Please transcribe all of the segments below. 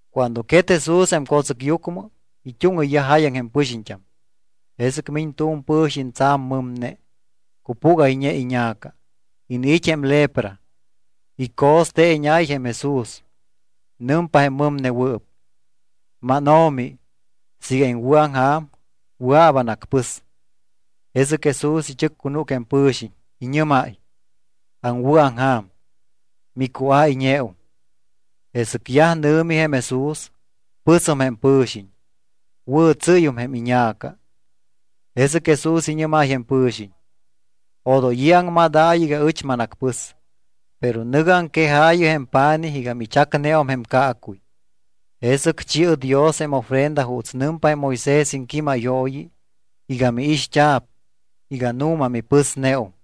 Cuando quet Jesús jém co̱tsɨcyucmɨ, it́úŋɨyyaj jáyaŋ jém pɨxiñt́am. Jesɨc miñ tu̱m pɨ̱xiñ tsa̱m mɨmne, cupúgayñe iña̱ca, iniit́ jém lepra. Ico̱steeñáy jém Jesús. Nɨmpa jém mɨmnewɨɨp: —MánO̱mi, siiga iŋwɨ̱aŋja̱m, wɨa̱p anacpɨs. Jesɨc Jesús ichɨccunúc jém pɨ̱xiñ, iñɨ́máy: —Aŋwɨ̱aŋja̱m. Micuáyñeum. Jesɨc yaj nɨ̱mi jém Jesús, pɨsum jém pɨ̱xiñ, wɨ̱tsɨ́yum jém iña̱ca. Jesɨc Jesús iñɨ́máy jém pɨ̱xiñ: —Odoy i̱ aŋmadaayɨ iga ɨch manacpɨs, pero nɨ̱gɨ aŋquejaayɨ jém pa̱nij iga michacneum jém caacuy. Jesɨc chi̱ɨ Dios jém ofrenda juuts nɨmpa jém Moisés iŋquímayooyi iga miixt́a̱p iga nu̱ma mipɨsneum.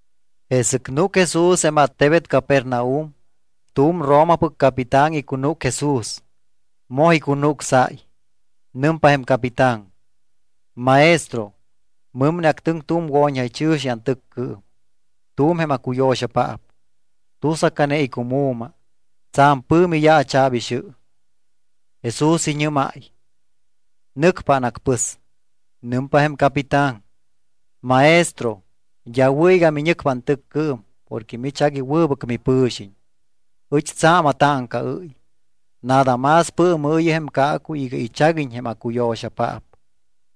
Jesɨc núc Jesús jém attebet Capernaum. Tu̱m Romapɨc capitán icunúc Jesús, moj icunucsáy. Nɨmpa jém capitán: —Maestro, mɨmne actɨŋ tu̱m wo̱ñjaychɨ̱xi antɨccɨɨm, tu̱m jém aŋcuyo̱xapaap. Tusacane icumu̱ma. Tsa̱m pɨ̱mi yaacha̱p ixɨ. Jesús iñɨ́máy: —Nɨcpa anacpɨs. Nɨmpa jém capitán: —Maestro, d́a wɨ̱ iga miñɨcpa antɨccɨɨm porque mich agui wɨbɨc mipɨ̱xiñ, ɨch tsa̱m atáŋcaɨ́y. Nada más pɨɨmɨɨyɨ jém caacuy iga ichaguiñ jém aŋcuyo̱xapaap,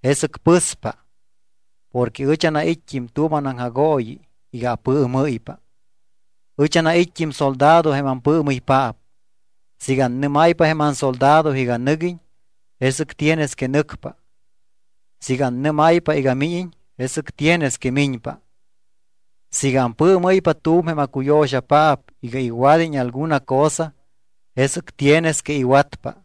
jesɨc pɨspa. Porque ɨch anait́t́im tu̱m anaŋjagooyi iga apɨɨmɨ́ypa. Ɨch anait́t́im soldado jém ampɨɨmɨypaap. Siiga annɨ́máypa jém ansoldado iga nɨguiñ, jesɨc tienes que nɨcpa. Siiga annɨ́máypa iga míñiñ, jesɨc tienes que miñpa. Siiga ampɨɨmɨ́ypa tu̱m jém acuyo̱xapaap iga iwad́iñ alguna cosa, jesɨc tienes que iwatpa.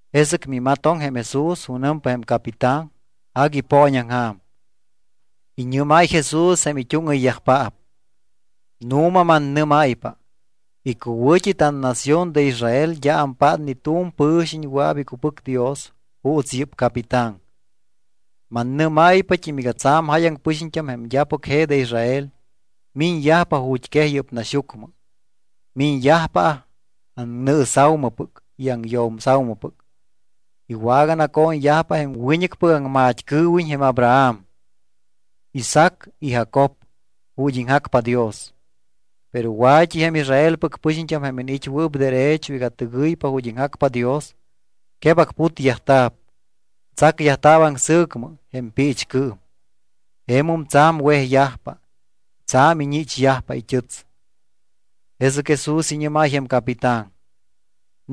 Jesɨc mimatoŋ jém Jesús junɨmpa jém capitán, agui ipooñaŋja̱m. Iñɨ́máy Jesús jém it́úŋɨyyajpaap: —Nu̱ma mannɨ́máypa, icuwɨ̱t́i tannación de Israel d́a ampát ni tu̱m pɨ̱xiñ wɨa̱p icupɨc Dios juuts yɨ́p capitán. Mannɨ́máypat́im iga tsa̱m jáyaŋ pɨxiñt́am jém d́apɨc je de Israel miñyajpa ju̱t́quej yɨ́p naxyucmɨ. Miñyajpa aŋnɨɨsa̱umɨpɨc y aŋyo̱msa̱umɨpɨc. Iwaganaco̱ñyajpa jém wiñɨcpɨc aŋmat́cɨɨwiñ jém Abraham, Isaac y Jacob ju̱t́ iŋjacpa Dios. Pero wa̱t́i jém Israelpɨc pɨxiñt́am jém iniit́wɨɨp derecho iga tɨgɨypa ju̱t́ iŋjacpa Dios, quebacputyajta̱p. Tsacyajta̱p aŋsɨ̱cmɨ jém piichcɨɨm. Jemum tsa̱m wejyajpa, tsa̱m iñichyajpa it́ɨts. Jesɨc Jesús iñɨ́máy jém capitán: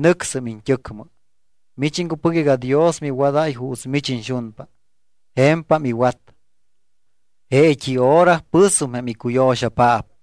—Nɨcsɨm iñt́ɨcmɨ. Mich iŋcupɨc iga Dios miwadáy juuts mich iñxunpa. Je̱mpam iwat. Jeet́i hora pɨsum jém icuyo̱xapaap.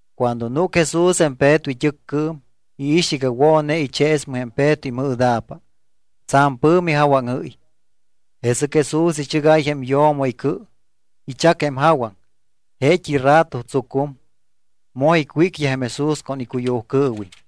Cuando núc Jesús jém Peto it́ɨccɨɨm, iix iga wo̱ne icheesmɨ jém Peto imɨɨda̱pa. Tsa̱m pɨ̱mi jawaŋɨ́y. Jesɨc Jesús ichɨgáy jém yo̱mo icɨ. Ichac jém jawaŋ, jeet́i rato tsucum, moj icwícyaj jém Jesús con icuyujcɨɨwiñ.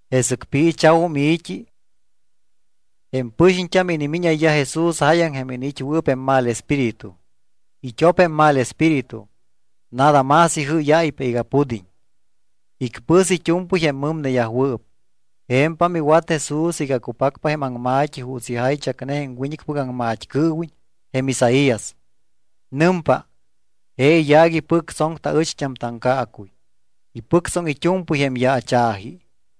Jesɨc piicha̱wum i̱t́i, jém pɨxiñt́am inimíñayyaj Jesús jáyaŋ jém iniit́wɨɨp jém mal espíritu. It́op jém mal espíritu, nada más ijɨ́yáypa iga pud́iñ. Icpɨs it́u̱mpɨy jém mɨmneyajwɨɨp. Je̱mpam iwat Jesús iga cupacpa jém aŋma̱t́i juuts ijaychacne jém wiñɨcpɨc aŋmat́cɨɨwiñ jém Isaías. Nɨmpa: “Je iyaac ipɨctsoŋ taɨcht́am taŋcaacuy. Ipɨctsoŋ it́u̱mpɨy jém yaacha̱ji.”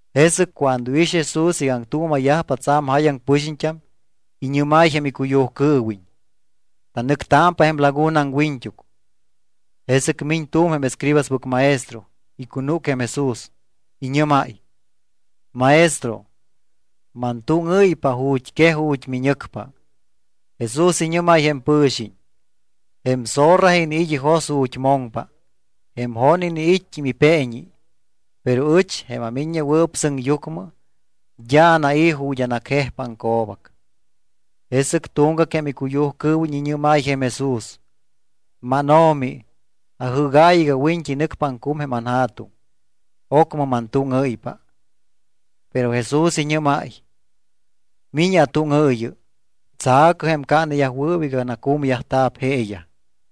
Jesɨc cuando iix Jesús iga aŋtuuma̱yajpa tsa̱m jáyaŋ pɨxiñt́am, iñɨ́máy jém icuyujcɨɨwiñ: —Tanɨctámpa jém laguna aŋwiñt́uc. Jesɨc miñ tu̱m jém escribaspɨc maestro. Icunúc jém Jesús, iñɨ́máy: —Maestro, mantúŋɨ́ypa ju̱t́quej ju̱t́ miñɨcpa. Jesús iñɨ́máy jém pɨ̱xiñ: —Jém zorra iniit́ ijos ju̱t́ moŋpa. Jém jon iniit́t́im ipeeñi. Pero ɨch, jém aMiññewɨɨp Sɨŋyucmɨ, d́a anai̱ ju̱t́ anacjejpa aŋco̱bac. Jesɨc tuŋgac jém icuyujcɨɨwiñ iñɨ́máy jém Jesús: —MánO̱mi, ajɨ́gaayɨ iga wiñt́i nɨcpa aŋcum jém anja̱tuŋ. Ocmɨ mantúŋɨ́ypa. Pero Jesús iñɨ́máy: —Mi̱ñɨ atúŋɨɨyɨ. Tsa̱cɨ jém caaneyajwɨɨp iga nacumyajta̱p jeeyaj.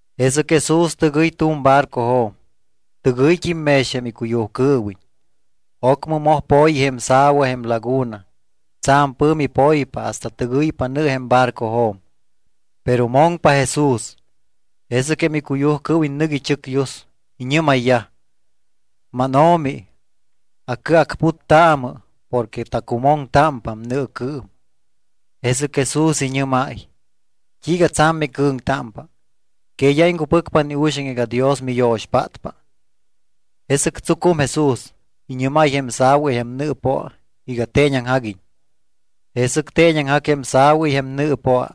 Jesɨc Jesús tɨgɨy tu̱m barcojo̱m. Tɨgɨyt́im mex jém icuyujcɨɨwiñ. Ocmɨ moj po̱yi jém sa̱wa jém laguna. Tsa̱m pɨ̱mi poypa hasta tɨgɨypa nɨ jém barcojo̱m. Pero moŋpa Jesús. Jesɨc jém icuyujcɨɨwiñ nɨc ichɨcyus. Iñɨ́mayyaj: —MánO̱mi, acɨacputtaamɨ porque tacumoŋtámpam nɨɨcɨɨm. Jesɨc Jesús iñɨ́máy: —¿T́iiga tsa̱m micɨ̱ŋtámpa? ¿Que d́a iŋcupɨcpa ni uxaŋ iga Dios miyo̱xpátpa? Jesɨc tsucum Jesús, iñɨ́máy jém sa̱wa y jém nɨɨpoa iga teeñaŋjaguiñ. Jesɨc teeñaŋjac jém sa̱wa y jém nɨɨpoa.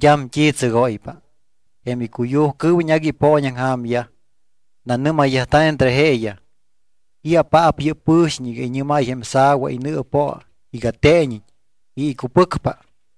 D́am t́i tsɨgóypa. Jém icuyujcɨɨwiñ agui ipooñaŋja̱myaj. Nanɨ́mayyajta̱ entre jeeyaj: —¿I̱apaap yɨ́p pɨ̱xiñ iga iñɨ́máy jém sa̱wa y nɨɨpoa iga teeñiñ y icupɨcpa?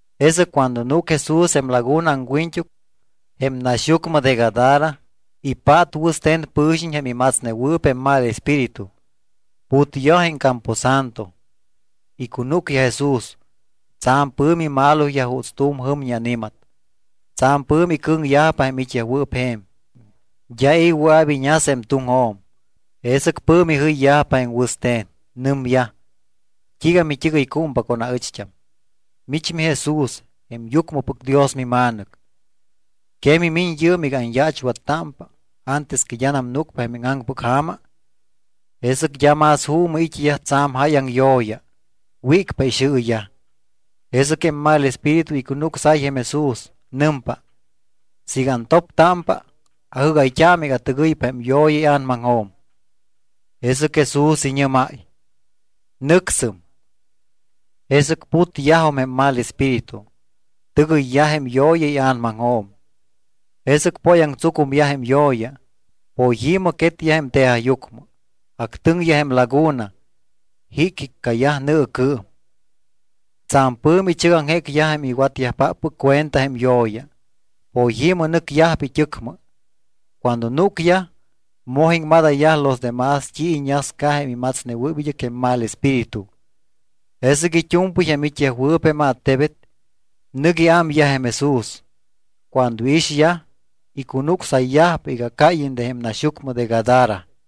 Jesɨc cuando núc Jesús jém laguna aŋwiñt́uc jém naxyucmɨ de Gadara, ipát wɨste̱n pɨ̱xiñ jém imatsnewɨɨp jém mal espíritu. Putyaj jém camposanto, icunúcyaj Jesús. Tsa̱m pɨ̱mi maloyaj juuts tu̱m jɨmñi ani̱mat. Tsa̱m pɨ̱mi icɨ̱ŋyajpa jém it́yajwɨɨp je̱m, d́a i̱ wɨa̱p iñas jém tuŋjo̱m. Jesɨc pɨ̱mi jɨyyajpa jém wɨste̱n. Nɨmyaj: —¿T́iiga mit́ɨgɨycúmpa con aɨcht́am? Mich miJesús jém Yucmɨpɨc Dios miMa̱nɨc. ¿Que mimiñ yɨɨm iga anyaachwattámpa antes que d́anam núcpa jém íŋaŋpɨc ja̱ma? Jesɨc d́a más juumɨ it́yaj tsa̱m jáyaŋ yo̱ya. Wícpa ixɨɨyaj. Jesɨc jém mal espíritu icunucsáy jém Jesús. Nɨmpa: —Siiga antoptámpa, ajɨ́gayt́aamɨ iga atɨgɨypa jém yo̱ya ia̱namaŋjo̱m. Jesɨc Jesús iñɨ́máy: —¡Nɨcsɨm! Jesɨc putyajum jém mal espíritu. Tɨgɨyyaj jém yo̱ya ia̱namaŋjo̱m. Jesɨc póyaŋtsucumyaj jém yo̱ya. Poyi̱mɨ quetyaj jém tejajyucmɨ, actɨŋyaj jém laguna, jicjiccayaj nɨɨcɨɨm. Tsa̱m pɨ̱mi ichɨgaŋjécyaj jém iwatyajpáppɨc cuenta jém yo̱ya. Poyi̱mɨ nɨcyajpa it́ɨcmɨ. Cuando núcyaj, moj iŋmadayyaj los demás t́i iñasca jém imatsnewɨɨp id́ɨc jém mal espíritu. Jesɨc it́u̱mpɨy jém it́yajwɨɨp jém attebet, nɨc iámyaj jém Jesús. Cuando iixyaj, icunucsayyajpa iga cáyiñ de jém naxyucmɨ de Gadara.